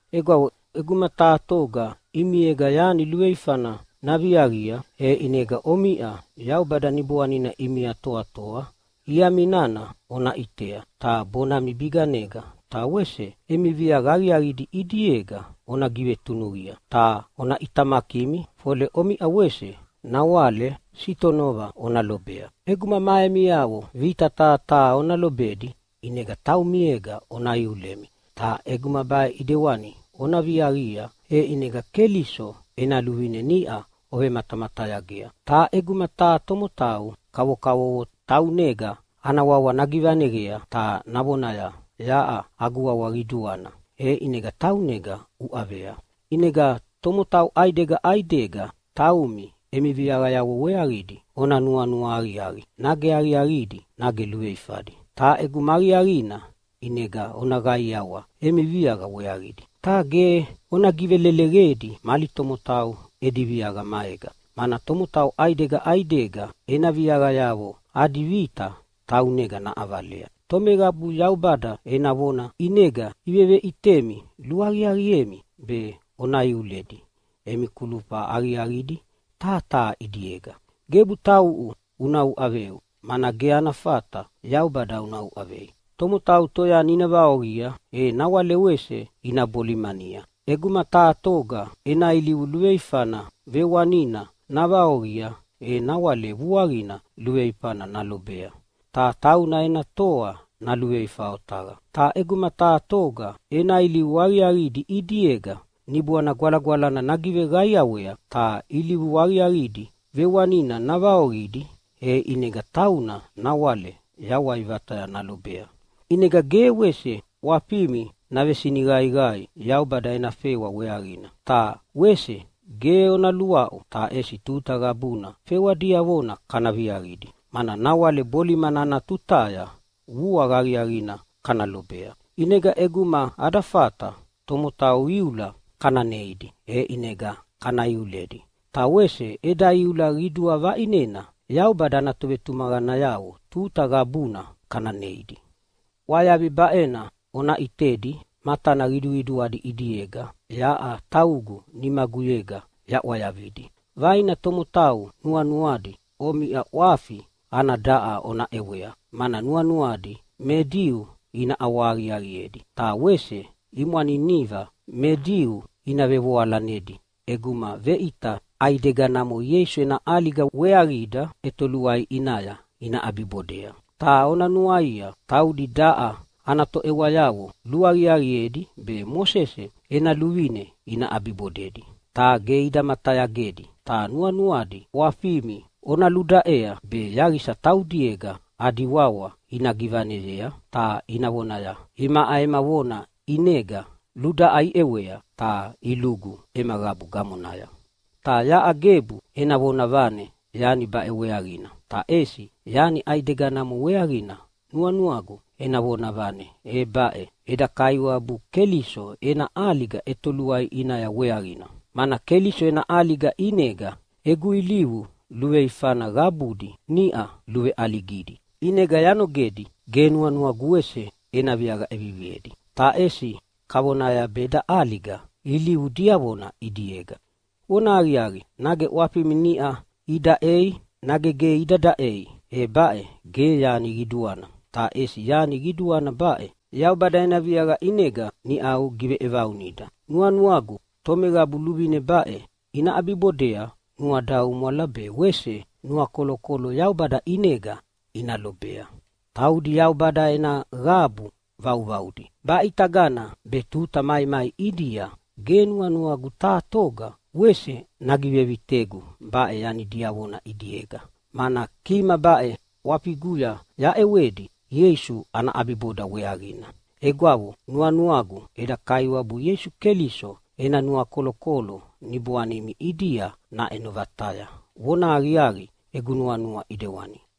Egwavo, ʼeguma taha toga ʼimiega yani luveifana naviaqia, e ʼinega omiʼa Yaubada Niboanina ʼimia toatoa iami nana ona ʼitea ta bonami biganega ta wese emi viaqa aqiaqidi ʼidiega ona givetunuqia. Ta ona ʼitamakimi, fole omiʼa wese nawale sitonova ona lobea. ʼEguma ma emiavo vita taha taha ona lobedi ʼinega taumiega ona iulemi. Ta ʼeguma baʼe ʼidewani ona viaqia, e ʼinega Keliso ena luvine niʼa ovematamatayagea. Ta ʼeguma taha tomotau kavokavovo taunega ana wawa nagivaneqea ta navonaya, “Yaʼa agu wawa qiduana!” e ʼinega taunega uʼavea. ʼInega tomotau ʼaidega ʼaidega taumi emi viaqayavo weaqidi ona nuanua aqiaqi nage aqiaqidi nage luveifadi. Ta ʼeguma aqiaqina ʼinega ona qaiawa emi viaqa weaqidi, ta ge ona giveleleqedi mali tomotau edi viaqa maega. Mana tomotau ʼaidega ʼaidega ena viaqayavo adi vita taunega naʼavalea. Tomeqabu Yaubada ena vona ʼinega iveveʼitemi luaqiaqiemi be ona iuledi emi kulufa aqiaqidi taha taha ʼidiega. Gebu tauʼu una uʼaveu! Mana ge ana fata Yaubada una uʼavei. Tomotau toyani ina vaoqia, e nawale wese ina bolimania. ʼEguma taha toga ena ilivu luveifana vewanina navaoqia, e nawale vuaqina luveifana nalobea ta tauna ena toa naluveifa otaqa. Ta ʼeguma taha toga ena ilivu aqiaqidi ʼidiega Niboana Gwalagwalana nagiveqaiawea ta ilivu aqiaqidi vewanina navaoqidi, e ʼinega tauna nawale yawai vataya nalobea. ʼInega ge wese ʼwafimi navesiniqaiqai Yaubada ena fewa weaqina ta wese ge ona luaʼu, ta ʼesi tuta qabuna fewa diavona kana viaviaqidi, mana nawale bolimana ana tutaya vuaqa aqiaqina kana lobea. ʼInega ʼeguma ada fata tomotau iula kana neidi, e ʼinega kana iuledi, ta wese eda iula qidua vaʼinena Yaubada ana tovetumaqanayavo tuta qabuna kana neidi. ʼWayavi baʼena ona ʼitedi matana qiduqiduadi ʼidiega yaʼa taugu nimaguyega yaʼwayavidi. Vaina tomotau nuanuadi omiʼa ʼwafi ana daʼa ona ʼewea, mana nuanuadi me Diu ina ʼawahaqiaqiedi, ta wese imwaniniva me Diu ina vevoalanedi ʼeguma veʼita ʼaideganamo Ieisu ena ʼaliga weaqida ʼetoluai ʼinaya ina ʼabibodea. Ta ona nuaia, taudi daʼa ana toʼewayavo luaqiaqiedi be Mosese ena luvine ina ʼabibodedi, ta ge ida matayagedi. Ta nuanuadi ʼwafimi ona ludaʼea be yaqisa taudiega adi wawa ina givaneyea ta ina vonaya, “Imaʼa ema vona ʼinega ludaʼa iʼewea ta ilugu ema qabu gamonaya.” Ta yaʼa gebu ena vonavane yani baʼe weaqina, ta ʼesi yani ʼaideganamo weaqina nuanuagu ena vonavane, e baʼe eda Kaiwabu Keliso ena ʼaliga ʼetoluai ʼinaya weaqina. Mana Keliso ena ʼaliga ʼinega egu ilivu luveifana qabudi niʼau luveʼaligidi, ʼinega yanogedi ge nuanuagu wese ena viaqa ʼeviviedi, ta ʼesi kavonaya be eda ʼaliga ilivu diavona ʼidiega. Vonahaqiaqi, nage ʼwafimi niʼa idaʼei nage ge ida daʼei, e baʼe ge yani qiduana. Ta ʼesi yani qiduana baʼe, Yaubada ena viaqa ʼinega niʼau giveʼevaunida. Nuanuagu tomeqabu luvine baʼe ina ʼabibodea nuadaumwala be wese nuakolokolo Yaubada ʼinega ina lobea. Taudi Yaubada ena qabu vauvaudi. Baʼitagana be tuta maimai ʼidia ge nuanuagu taha toga wese nagivevitegu baʼe yani diavona ʼidiega, mana kima baʼe ʼwafiguya yaʼewedi Ieisu ana ʼabiboda weaqina. Egwavo, nuanuagu eda Kaiwabu Ieisu Keliso ena nuakolokolo niboanimi ʼidia naʼeno vataya. Vonahaqiaqi, egu nuanua ʼidewani.